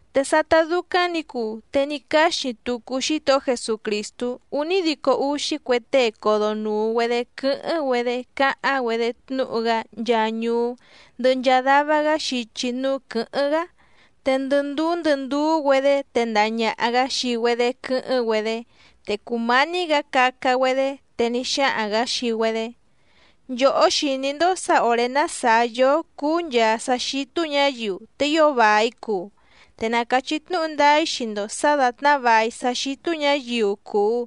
Te sátá dúcáⁿ nǐ cuu, te ní cáxi tucu Xítohó Jesucrìstú únídico úxí cue tée codonùu‑güedé quɨ́hɨ́ⁿ‑güedé cáháⁿ‑güedé tnúhu‑gá nchaa ñuú, ndɨhɨ nchaa dava‑gá xichi núú quɨ̌hɨ́ⁿ‑gá, te ndɨ ndúú ndɨ ndúú‑güedě tendaha ñàha‑gá xii‑güedé quɨ́hɨ́ⁿ‑güedé. Te cùmání‑gǎ caca‑güedé, te ní xáhaⁿ‑gǎ xii‑güedé: —Nchòhó xìní‑ndó sǎ òré ná sàá yóó cuu nchaa sá xítú ñǎyiu, te ío vài cuu. Te na càchí tnúhu ndáá‑í xii‑ndo sǎ dàtná vài sá xítú ñǎyiu cùu,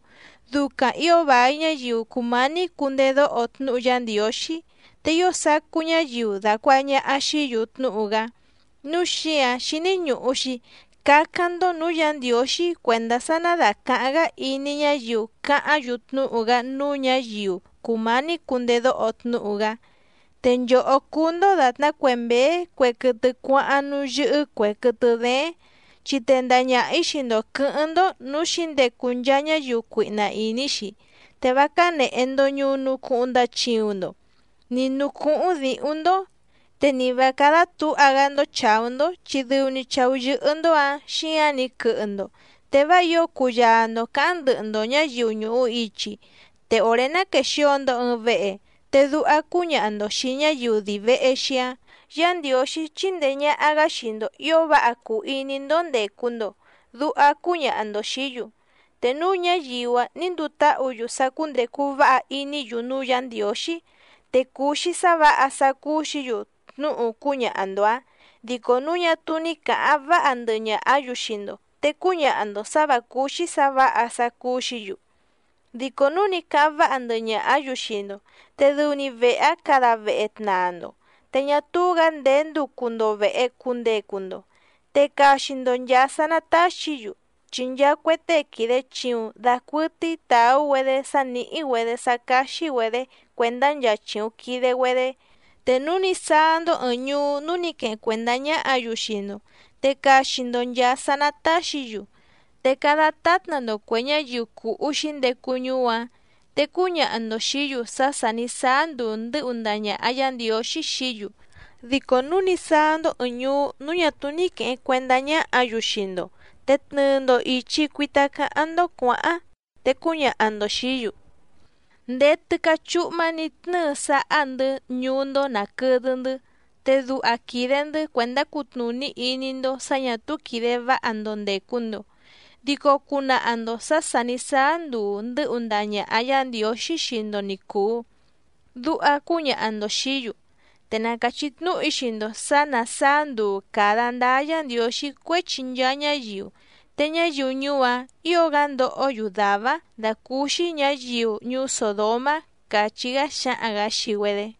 ducaⁿ ǐo vài ñáyiu cùmání cundedóho tnúhu Yá Ndiǒxí te ío sacú ñáyiu dàcuaha ñaha xií‑yu tnúhu‑gá, núu xíǎⁿ xíní ñùhu‑xi cácáⁿ‑ndó nǔú Yǎ Ndiǒxí cuèndá sá ná dàcaháⁿ‑gá iní ñáyiu cáháⁿ‑yu tnúhu‑gá núú ñǎyiu cùmání cundedóho tnúhu‑gá. Te nchòhó cúú‑ndó dàtná cue mběé cue quɨtɨ cuáháⁿ núú yɨ́hɨ́ cuè quɨtɨ dééⁿ. Chi tendaha ñaha‑ǐ xii‑ndo quɨ̌hɨ́ⁿ‑ndó nǔú xǐndecu nchaa ñáyiu cuihna ìní‑xi. Te vá cánèhe‑ndo ñunu cuhuⁿ ndachiuⁿ‑ndo, ni nǔú cúhúⁿ dǐhúⁿ‑ndó, te ni vǎ cádá tǔha‑gá‑ndó chàú‑ndó chi dɨu‑ni chàú yɨ́hɨ́‑ndó‑ǎⁿ xíǎⁿ‑ni quɨhɨ‑ndo, te vá ǐo cuyaa‑ndo cǎháⁿ ndɨhɨ‑ndo ñǎyiu ñùhu ichi. Te òré ná quèxio‑ndo ɨɨⁿ vehe, te duha cúñaha‑ndo xìi ñáyiu dii vèhe‑xi‑áⁿ: “Yá Ndiǒxí chindee ñàha‑gá xii‑ndo ǐo váha cuu iní‑ndó cùndecu‑ndo”, duha cúñaha‑ndo xìí‑yu. Te núu ñáyiu‑áⁿ nǐ nduu táhǔ‑yu sá cúndècu váha iní‑yu núú Yǎ Ndiǒxí, te cuu‑xi sá vǎha sá cúú‑xǐ‑yu tnúhu cúñaha‑ndo‑ǎⁿ, dico núu ñá túú ní càháⁿ váha ndɨhɨ ñàhá‑yu xii‑ndo, te cúñaha‑ndo sǎ vǎ cúú‑xí sǎ vǎha sá cúú‑xǐ‑yu. Dico núu ní cáháⁿ váha ndɨhɨ ñàhá‑yu xii‑ndo, te dɨu‑ni vehe‑áⁿ cada vehe tnaa‑ndo, te ñá túú‑gǎ ndèé nducu‑ndo vèhe cundecu‑ndo, te caxi‑ndo nchàa sá ná tàxí‑yu, chi nchaa cue tée quìde chiuⁿ dacuɨtɨ́í tàú‑güedé sá nìhí‑güedé sá cáxí‑güedě cuèndá nchaa chìuⁿ quide‑güedé. Te núu ní sáá‑ndó ɨ̀ɨⁿ ñuú núú nǐ queheⁿ cuèndá ñáhǎ‑yu xii‑ndo, te caxi‑ndo nchàa sá ná tàxí‑yu. Te cada tátna‑ndo cuè ñáyiu cùhú xǐndecu ñuú‑áⁿ, te cúñaha‑ndo xìí‑yu sá sà ní sáá nduu ndɨ́hu ndaha ñàha Yá Ndiǒxí xií‑yu. Dico núu ní sáá‑ndó ɨ̀ɨⁿ ñuú núú ñà túú ní quèheⁿ cuendá ñáhǎ‑yu xii‑ndo, te tnɨɨ‑ndo ìchi cuita cáháⁿ‑ndó cuǎháⁿ, te cúñaha‑ndo xìí‑yu: “Ndéé tɨ́cá chúhmá nǐ tnɨ́ɨ sáhá‑ndɨ̌ ñuú‑ndó nàquɨdɨ‑ndɨ́, te duha quìde‑ndɨ́ cuèndá cutnùní iní‑ndó sǎ ñà túú quìde váha‑ndo ndècu‑ndo. Dico cunaha‑ndo sǎ sà ní sáá nduu ndɨ́hu ndaha ñàha Yá Ndiǒxí xii‑ndo ni cùu”, duha cúñaha‑ndo xìí‑yu. Te na càchí tnúhu‑í xii‑ndo sǎ ná sàá nduu càda ndáá Yǎ Ndiǒxí cuéchi nchaa ñáyiu, te ñáyiu ñuú‑áⁿ ǐo‑gá ndohó‑yu dàvá‑áⁿ dàcúúxí ñǎyiu ñuú Sòdomá —càchí‑gá xáhaⁿ‑gǎ xii‑güedé.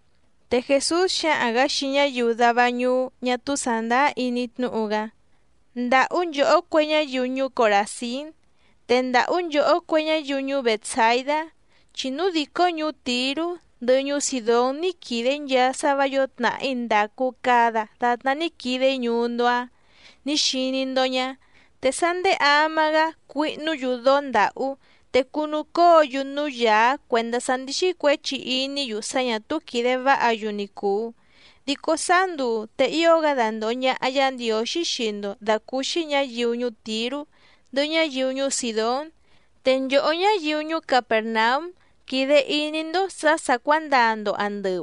Te Jèsús xáhaⁿ‑gǎ xii ñáyiu dava ñuú ñá túú sàndáá iní tnúhu‑gá: —¡Ndàhú nchòhó cue ñáyiu ñuú Coràzín! ¡Te ndàhú nchòhó cue ñáyiu ñuú Bètsaidá! Chi núu dìcó ñuú Tìrú, ndɨhɨ ñuú Sìdón ní quìde‑í nchaa sá vǎ yǒo tnàhí ndàcu cada datná ní quide‑í ñuú‑ndó‑áⁿ nǐ xiní‑ndó ñá, te sá nděé ama‑gá cuihnú‑yu dóó ndàhú, te cunucóo‑yu núú yàá cuèndá sá ndíxí cuěchi iní‑yu sá ñà túú quìde váha‑yu ni cùu. Dico sáá nduu te ío‑gá dandòho ñaha Yá Ndiǒxí xii‑ndo dàcúúxí ñǎyiu ñuú Tìrú, ndɨhɨ ñáyiu ñuú Sìdón. Te nchòhó ñáyiu ñuú Capèrnaúm quìde iní‑ndó sǎ sà cuándaa‑ndo àndɨu,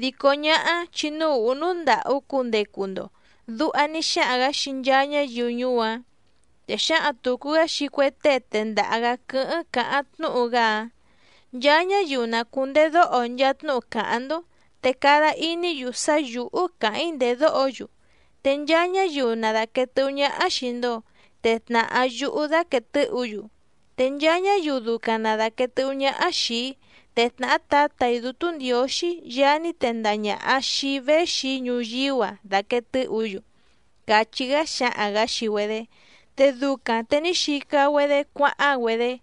dico ñáhá chi núú ùhú núú ndàhú cundecu‑ndo —duha ní xáhaⁿ‑gǎ xii nchaa ñáyiu ñuú‑áⁿ. Te xǎhaⁿ tùcu‑gá xii cue tée tendaha‑gǎ quɨ́hɨ́ⁿ cáháⁿ tnúhu‑gá‑áⁿ: —Nchaa ñáyiu na cùndedóho nchaa tnúhu cáháⁿ‑ndó, te cada iní‑yu sá yǔhú càháⁿ‑í ndèdóho‑yu, te nchaa ñáyiu na dàquee tɨhú ñáhá xìi‑ndo, te tnàhá yúhú daquèe tɨ́hǔ‑yu, te nchaa ñáyiu ducaⁿ na dàquee tɨ́hú ñáhá xìi‑í, te tnàhá Tǎtà‑í Dútú Ndiǒxí Yaá ní tendaha ñàha xii‑í véxi‑í ñuyíú‑a dàquee tɨ́hǔ‑yu —càchí‑gá xáhaⁿ‑gǎ xii‑güedé. Te ducaⁿ te ní xica‑güedé cuáháⁿ‑güedé.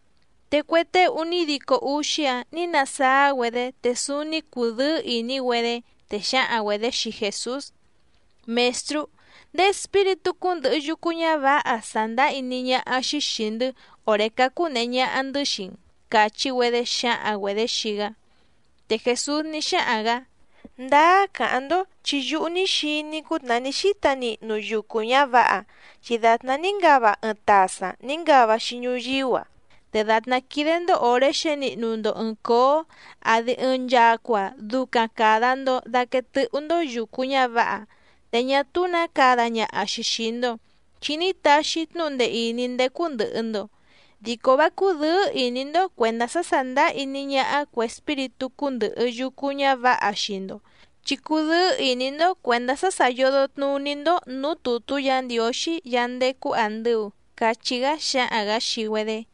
Te cue tée únídico úxí‑áⁿ nǐ nasáá‑güedé te súúní cùdɨ́ɨ́ ìní‑güedé, te xǎhaⁿ‑güedě xii Jèsús: —Mèstrú, ndéé espíritú cúndɨ̀hɨ yucu ñávǎha sàndáá iní ñáhá‑xí xìi‑ndɨ́ òré cácú nèhe ñaha‑ndɨ́ xii‑n —càchí‑güedé xǎhaⁿ‑güedě xii‑gá. Te Jèsús ní xáhaⁿ‑gǎ: —Ndáá càháⁿ‑ndó chi yúhú ní xiní‑í cútnàhá ní xíta nihnu yucu ñǎvǎha, chi dàtná ní ngava ɨɨⁿ tasaⁿ nǐ ngava‑xi ñuyíú‑a. Te dàtná quídé‑ndó òré xěnihnu‑ndo ɨ̀ɨⁿ cóó, àdi ɨɨⁿ nchacua ducaⁿ cada‑ndo daquee tɨ́hú‑ndó yùcu ñávǎha, te ñá túú nǎ cada ñaha‑xi xìi‑ndo, chi ní taxi‑í tnúhu ndee ìní ndécú ndɨ̀hɨ‑ndo. Dico vá cúdɨ̌ɨ́ ìní‑ndó cuèndá sá sàndáá iní ñáhá cuè espíritú cúndɨ̀hɨ yucu ñávǎha xii‑ndo, chi cudɨ́ɨ́ ìní‑ndó cuèndá sá sà yodo tnuní‑ndó nǔú tùtú Yǎ Ndiǒxí Yaá ndécú àndɨu —cachí‑gá xáhaⁿ‑gǎ xii‑güedé.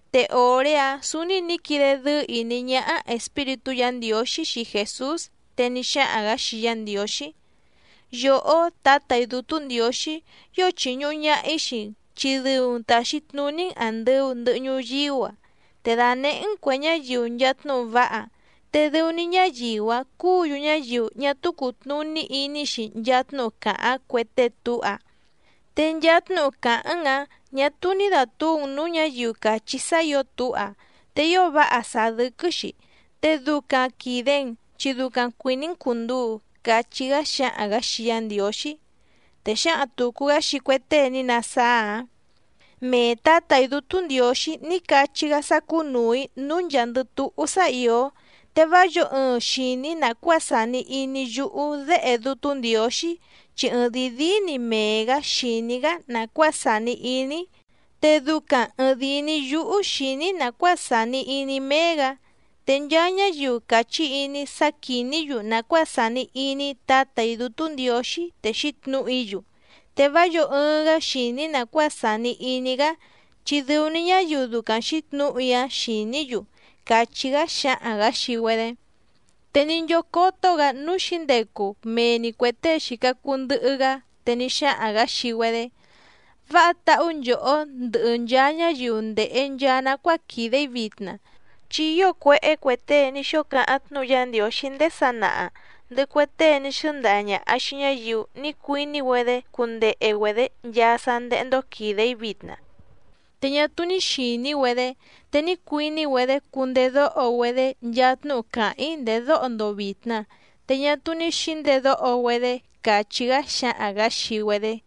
Te òré‑áⁿ sǔúní nǐ quide dɨ́ɨ́ ìní ñáhá Espíritú Yǎ Ndiǒxí xii Jèsús, te ní xáhaⁿ‑gǎ xii Yá Ndiǒxí: —Yòhó Tǎtà‑í Dútú Ndiǒxí, ío chìñuhu ñaha‑í xii‑n chi dɨu‑n tàxi tnuní‑n àndɨu ndɨhɨ ñuyíú‑a, te dànehé‑n cuè ñáyiu nchaa tnúhu váha, te dɨu‑ni ñáyiu‑áⁿ cúǔ‑yu ñáyiu ñá túú cùtnuní iní‑xi nchaa tnúhu càháⁿ cue tée túha, te nchaa tnúhu càháⁿ‑n‑ǎⁿ ñà túú ní dàtúu‑n nǔú ñǎyiu càchí sá ǐo túha, te ío váha sàá dɨ́quɨ́‑xi. Te ducaⁿ quìde‑n, chi ducaⁿ cuìní‑n cùnduu —cachí‑gá xáhaⁿ‑gǎ xii Yá Ndiǒxí. Te xǎhaⁿ tùcu‑gá xii cue tée ní nasáá‑áⁿ: —Mee Tǎtà‑í Dútú Ndiǒxí ní cachí‑gá sá cúnùu‑í núú nchàa‑ndɨ túhú sá ìó. Te vá yǒo ɨɨⁿ xìní nàcuáa sàni iní yúhú Déhe Dútú Ndiǒxí, chi ɨɨⁿdìi díí‑ni mee‑gǎ xìní‑gá nàcuáa sàni iní‑í. Te ducaⁿ ɨ̀ɨⁿdii‑ni yúhú xìní‑í nàcuáa sàni iní méé‑gǎ, te nchaa ñáyiu càchí iní‑í sá quìní‑yu nàcuáa sàni iní Tǎtà‑í Dútú Ndiǒxí te xǐtnǔhu‑í‑yu, te vá yǒo ɨɨⁿ‑gá xìní nàcuáa sàni iní‑gá chi dɨu‑ni ñáyiu ducaⁿ xǐtnǔhu‑í‑áⁿ xìní‑yu —càchí‑gá xáhaⁿ‑gǎ xii‑güedé. Te ní nchócótó‑gǎ núú xǐndecu mee‑ni cuè tée xìca cuu ndɨhɨ‑gá, te ní xáhaⁿ‑gǎ xii‑güedé: —Váha táhú nchòhó ndɨhɨ nchaa ñáyiu ndèhe nchaa nacuáa quìde‑í vitna. Chi ío cuéhé cue tée ní xóo cáháⁿ tnúhu Yá Ndiǒxí ndéé sanaha, ndɨhɨ cue tée ní xɨ́ndaha ñàha xii ñáyiu ní cuiní‑güedé cundehe‑güedě nchaa sá ndéhé‑ndó quìde‑í vitna, te ñá túú ní xìní‑güedé, te ní cuiní‑güedé cundedóho‑güedé nchaa tnúhu càháⁿ‑í ndèdóho‑ndo vìtna, te ñá túú ní xǐndedóho‑güedé —càchí‑gá xáhaⁿ‑gǎ xii‑güedé.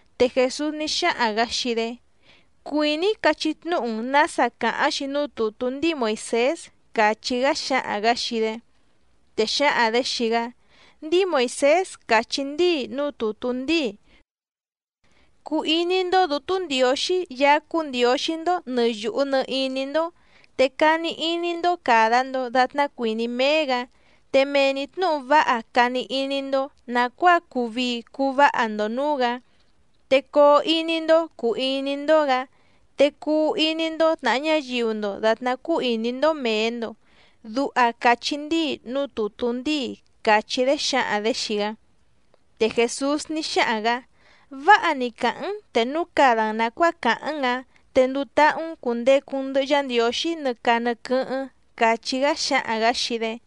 Te Jèsús ní xáhaⁿ‑gǎ xii‑dé: —Cuìní‑í cachí tnúhu‑n nǎsa càháⁿ‑xi núú tùtú ndíi Moìsés —càchí‑gá xáhaⁿ‑gǎ xii‑dé. Te xǎhaⁿ‑dě xii‑gá: —Ndíi Moìsés càchí ndíi núú tùtú ndíi: “Cuu iní‑ndó Dǔtú Ndiǒxí Yaá cúú Ndiǒxí‑ndó nɨ̀ yuhu nɨ iní‑ndó, te cani iní‑ndó càda‑ndo datná cuìní méé‑gǎ, te mee‑ni tnǔhu váha cani iní‑ndó nàcuáa cuu vii cuu váha‑ndo nǔú‑gǎ, te coo iní‑ndó cùu iní‑ndó‑gǎ. Te cuu iní‑ndó tnàha ñáyiu‑ndo dàtná cúú ìní‑ndó mèe‑ndo”, duha càchí ndíi núú tùtú ndíi —càchí‑dé xǎhaⁿ‑dě xii‑gá. Te Jèsús ní xáhaⁿ‑gǎ: —Váha‑ni càháⁿ‑n, te núu cada‑n nàcuáa càháⁿ‑n ǎⁿ, te nduu táhú‑n cùndecu‑n ndɨhɨ Yá Ndiǒxí nɨ caa nɨ quɨ́hɨ́ⁿ —càchí‑gá xáhaⁿ‑gǎ xii‑dé.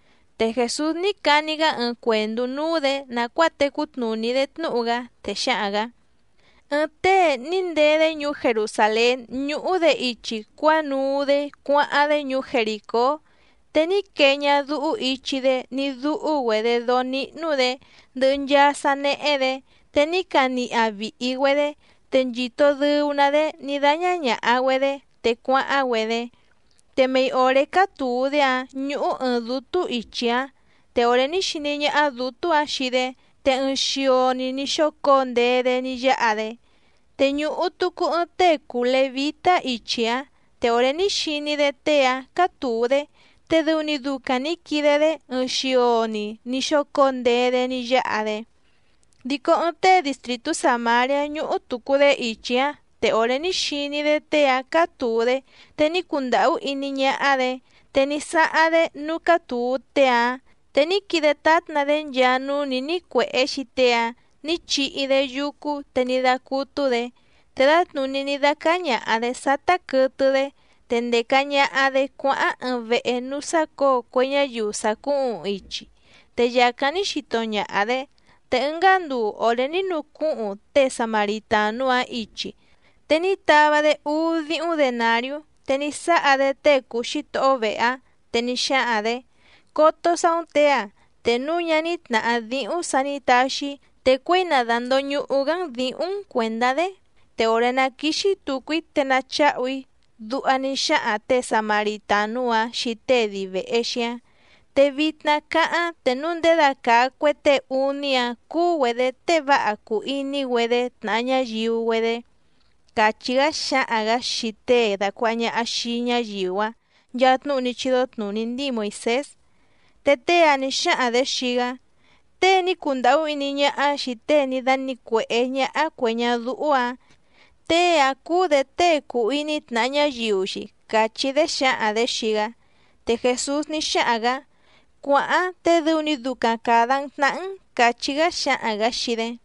Te Jèsús ní cani‑gá ɨɨⁿ cuèndú núú‑dě nàcuáa tecú tnùní‑dé tnúhu‑gá, te xáhaⁿ‑gǎ: —Ɨɨⁿ tée ní ndee‑dé ñuú Jerusàlén ñúhú‑dě ichi cuánuu‑dé cuáháⁿ‑dé ñuú Jerìcó, te ní quee ñadúhú ichi‑dé ní dúhú‑güedě dóó níhnú‑dě, ndɨhɨ nchaa sá néhé‑dě, te ní caniha vìhi‑güedé, te nchìto dɨu‑ná‑dé ní dáñá ñàha‑güedé te cuáháⁿ‑güedé. Te mei òré cátùu‑dé‑áⁿ ñúhú ɨ̀ɨⁿ dútú ichi‑áⁿ, te òré ní xiní ñáhá dǔtú‑ǎⁿ xii‑dé, te ɨɨⁿ xio‑ni ní xócǒo ndee‑dé ní yáha‑dé. Te ñùhu tucu ɨɨⁿ tée cùu levítá ichi‑áⁿ, te òré ní xiní‑dé tée‑áⁿ cátùu‑dé, te dɨu‑ni ducaⁿ nǐ quide‑dé ɨɨⁿ xio‑ni ní xócǒo ndee‑dé ní yáha‑dé. Dico ɨɨⁿ tée distrìtú Sàmariá ñúhú tùcu‑dé ichi‑áⁿ te òré ní xiní‑dé tée‑áⁿ cátùu‑dé, te ní cundàhú iní ñáhá‑dě. Te ní sáháⁿ‑dé núú cátùu tée‑áⁿ, te ní quide tátna‑dé nchaa núú nǐ nícuèhé xii tée‑áⁿ nǐ chihi‑dé yúcú, te ní dácútú‑dě. Te dǎtnùní ní dácáá ñàha‑dé sátá quɨtɨ‑dé, te ndèca ñaha‑dé cuáháⁿ ɨɨⁿ vehe núú sácǒo cue ñáyiu sàcúhuⁿ ichi, te yàcáⁿ ní xito ñaha‑dě. Te ɨngá nduu òré ní nucúhuⁿ tée Samaritànú‑áⁿ ichi, te ní tava‑dé úú díhúⁿ denàriú, te ní sáha‑dé tée cùu xítohó vehe‑áⁿ, te ní xáhaⁿ‑dě: “Coto saú‑n těe‑a, te núu ñá ní tnàhá díhúⁿ sǎ nǐ taxi‑í, te cuěi na dàndoñuhu‑gá‑n dǐhúⁿ‑n cuèndá‑dé, te òré ná quìxi tucu‑í te nacháhu‑í”, duha ní xáhaⁿ těe Samaritànú‑áⁿ xii tée dii vèhe xíáⁿ. Te vitna cáháⁿ, te núu ndědacàa cue tée úní‑áⁿ cúú‑güedě tée váha cùu iní‑güedé tnàha ñáyiu‑güedé —càchí‑gá xáhaⁿ‑gǎ xii tée dàcuaha ñaha xii‑í ñáyiu‑áⁿ nchaa tnúhu ní chídó tnùní ndíi Moìsés. Te tée‑áⁿ nǐ xáhaⁿ‑dě xii‑gá: —Tée ní cundàhú iní ñáhá xìi tée ní dánǐcuèhé ñáhá cuè ñadúhú‑ǎⁿ, tée‑áⁿ cúú‑dě tée cùu iní tnàha ñáyiu‑xi —càchí‑dé xǎhaⁿ‑dě xii‑gá. Te Jèsús ní xáhaⁿ‑gǎ: —Cuàháⁿ te dɨu‑ni ducaⁿ càda‑n tnahá‑n —càchí‑gá xáhaⁿ‑gǎ xii‑dé.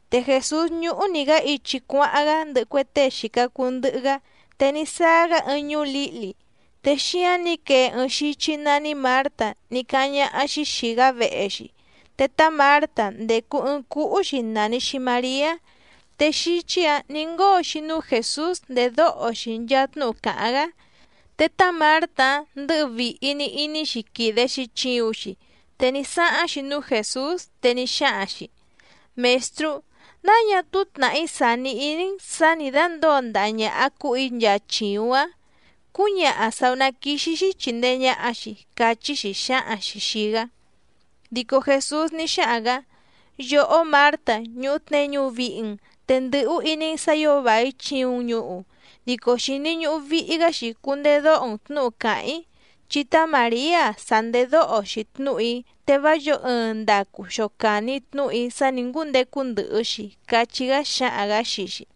Te Jèsús ñúhú‑ni‑gǎ ichi cuáháⁿ‑gá ndɨhɨ cue tée xìca cuu ndɨhɨ‑gá, te ní sáá‑gá ɨɨⁿ ñuú lǐhli, te xíáⁿ nǐ quee ɨɨⁿ xíchí nání Mǎrta ní cáháⁿ ñáhá‑xí xìi‑gá vehe‑xi. Te tá Mǎrta ndècu ɨɨⁿ cúhú‑xi nàni‑xi Mariá, te xíchí‑ǎⁿ nǐ ngóo‑xi núú Jèsús ndèdóho‑xi nchaa tnúhu càháⁿ‑gá. Te tá Mǎrta‑áⁿ ndɨ̌hɨ vìhi‑ni iní‑xi quìde‑xi chiuⁿ‑xi, te ní sáháⁿ‑xi núú Jèsús, te ní xáhaⁿ‑xi: —Mèstrú, ¿náa ñá túú tnàhí sàni iní‑n sǎ nǐ dándǒo ndaha ñàha cúhù‑í nchaa chìuⁿ‑áⁿ? Cúñaha sàú ná quìxi‑xi chindee ñaha‑xi —cachí‑xi xǎhaⁿ‑xi xìi‑gá. Dico Jèsús ní xáhaⁿ‑gǎ: —Yòhó Mǎrta, ñùhu tneñu vihi‑n, te ndɨ̀hú iní‑n sǎ ǐo vài chiuⁿ‑n ñuhu, dico xìni ñuhu vihi‑gá‑xi cundedóho‑n tnǔhu càháⁿ‑í, chi tá Màriá‑a sa ndèdóho‑xi tnúhu‑í, te vá yǒo ɨɨⁿ ndacu xocàni tnúhu‑í sá nǐ ngúndecu ndɨhɨ‑xi —càchí‑gá xáhaⁿ‑gǎ xii‑xi.